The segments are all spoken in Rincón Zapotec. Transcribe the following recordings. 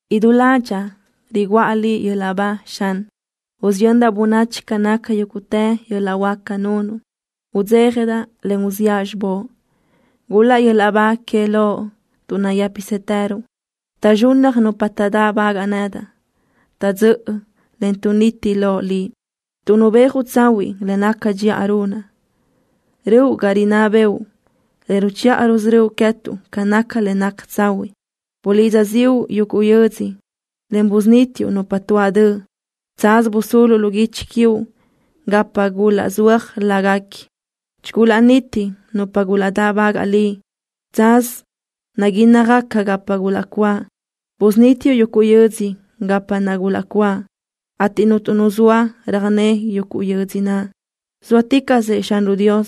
¡Idú ládxaʼa riguʼa Liʼ yöl-laʼ ba, Xan! ¡Usiyöndaʼ bönachi ca naca yúguʼtë yöl-laʼ huáca nunuʼ! ¡Udzéjadaʼ, en uziʼa xibóʼ! ¡Gul-laʼ yöl-laʼ ba que Loʼ, tuʼ nayë́pisëtëruʼ! ¡Taʼzxunnaj nupa taʼdáʼbagaʼ nedaʼ! ¡Taʼdzö́ʼö, en tuʼniti loʼ Liʼ, tuʼ nubéajuʼ tsahuiʼ le naca dxiʼa runaʼ! ¡Röʼu ga rinná bëʼu, en ruchiʼa rusörö́uʼ queë́tuʼ ca naca le naca tsahuiʼ! Bulidza ziʼu yuguʼ yödzö, en busunítiuʼ nupa tuáʼ döʼ. Tsaz busuluʼ lu guichi quiuʼ gapa gulaʼzúaj láguequi. Chigulaʼniti nupa gulaʼdáʼbagaʼ Liʼ. Tsaz naguínnajgaca gapa gulaʼcuáʼ. Busunítiuʼ yuguʼ yödzö gapa naʼ gulaʼcuáʼ, ateʼ cuntu nu zoa röjné yuguʼ yödzö naʼ. Zóaticaʼsëʼ Xanruʼ Dios.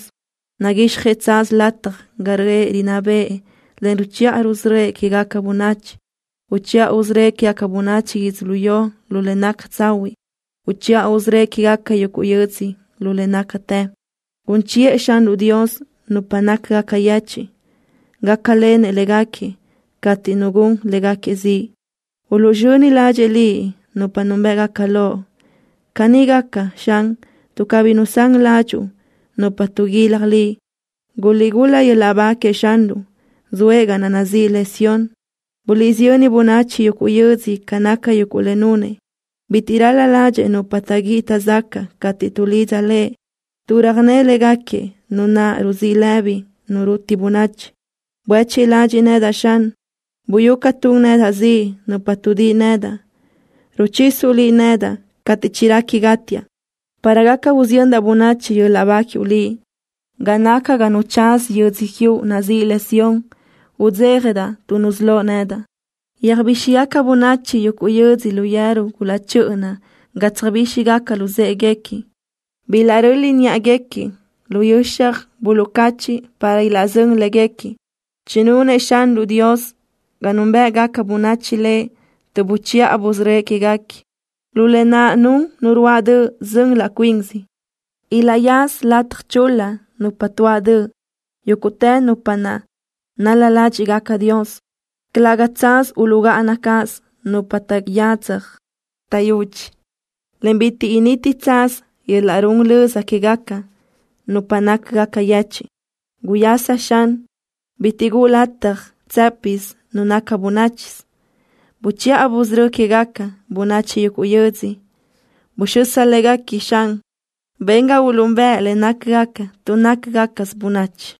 Naguixjëʼ tsaz lataj ga röʼë rinná bëʼë en ruchiʼa rusörö́ëʼ quégaca bönachi. Uchiʼa usörö́ëʼ quégaca bönachi yödzölió lu le naca tsahuiʼ. Uchiʼa usörö́ëʼ quégaca yuguʼ yödzö lu le nácatë. Gun chiʼë Xanruʼ Dios nupa nácagaca yechiʼ. Gácalenëʼ léguequi cateʼ nu gun léguequi ziʼ. Uluʼzxöni ladxiʼ Liʼ nupa núnbëʼgaca Loʼ. Caní gaca, Xan, tuʼ cabí nusán ládxuʼu nupa tuʼguilaj Liʼ. Guliʼgul-la yöl-laʼ ba queëʼ Xanruʼ, zoëʼ ga naʼ nazíʼi le Sión. Buliʼsiyö́n bönachi yuguʼ yödzö ca naca yuguʼ le nunëʼ. Bitiʼ ral-la ládxëʼë nupa taʼguíʼi taʼzacaʼ cateʼ tuʼlidza Lëʼ, tuʼ röjné léguequi Nu naʼ ruzíʼ lëbi nu ruti bönachi. Buéchiʼ ladxiʼ nedaʼ, Xan. Buyú ca tun nedaʼ ziʼ nupa tuʼdíʼi nedaʼ. Ruchisuʼ Liʼ nedaʼ cateʼ chirequi gátiaʼ para gaca usiyöndaʼ bönachi yöl-laʼ ba quiuʼ Liʼ. Ga naca ga nu tsaza yödzö quiuʼ nazíʼi le Sión, udzéjadaʼ tuʼ nusölóʼ nedaʼ. Yöjbíxigaca bönachi yuguʼ yödzö lu yeru gulaʼchö́ʼöna ga tsöjbíxigaca luzë́ʼeguequi. Bilaʼröli niʼaguequi lu yöxaj buluʼcachiʼ para ilaʼzö́n léguequi. Chinunëʼ Xanruʼ Dios ga núnbëʼgaca bönachi Lëʼ tuʼ buchiʼa busörö́ëʼ quéguequi. Lu lë naʼ nun nu ruáʼ döʼ zön laʼ cuinsi. Ilaʼyaza lataj chul-la nupa tuáʼ döʼ, yúguʼtë nupa naʼ nal-la ládxiʼgaca Dios. Calëga tsaz uluʼgáʼana cáʼasö nupa taʼyadzaj taʼyudxi, en bitiʼ initi tsaz yöl-laʼ run löza quégaca nupa nácagaca yechiʼ. Guyasa, Xan. Bitiʼ guʼu lataj tsë́pisë nu naca bönáchisö. Buchiʼa busörö́ quégaca bönachi yuguʼ yödzö. Buxö́s léguequi, Xan. Ben ga uluʼúnbëʼ le nácgaca, tuʼ nácagacasö bönachi.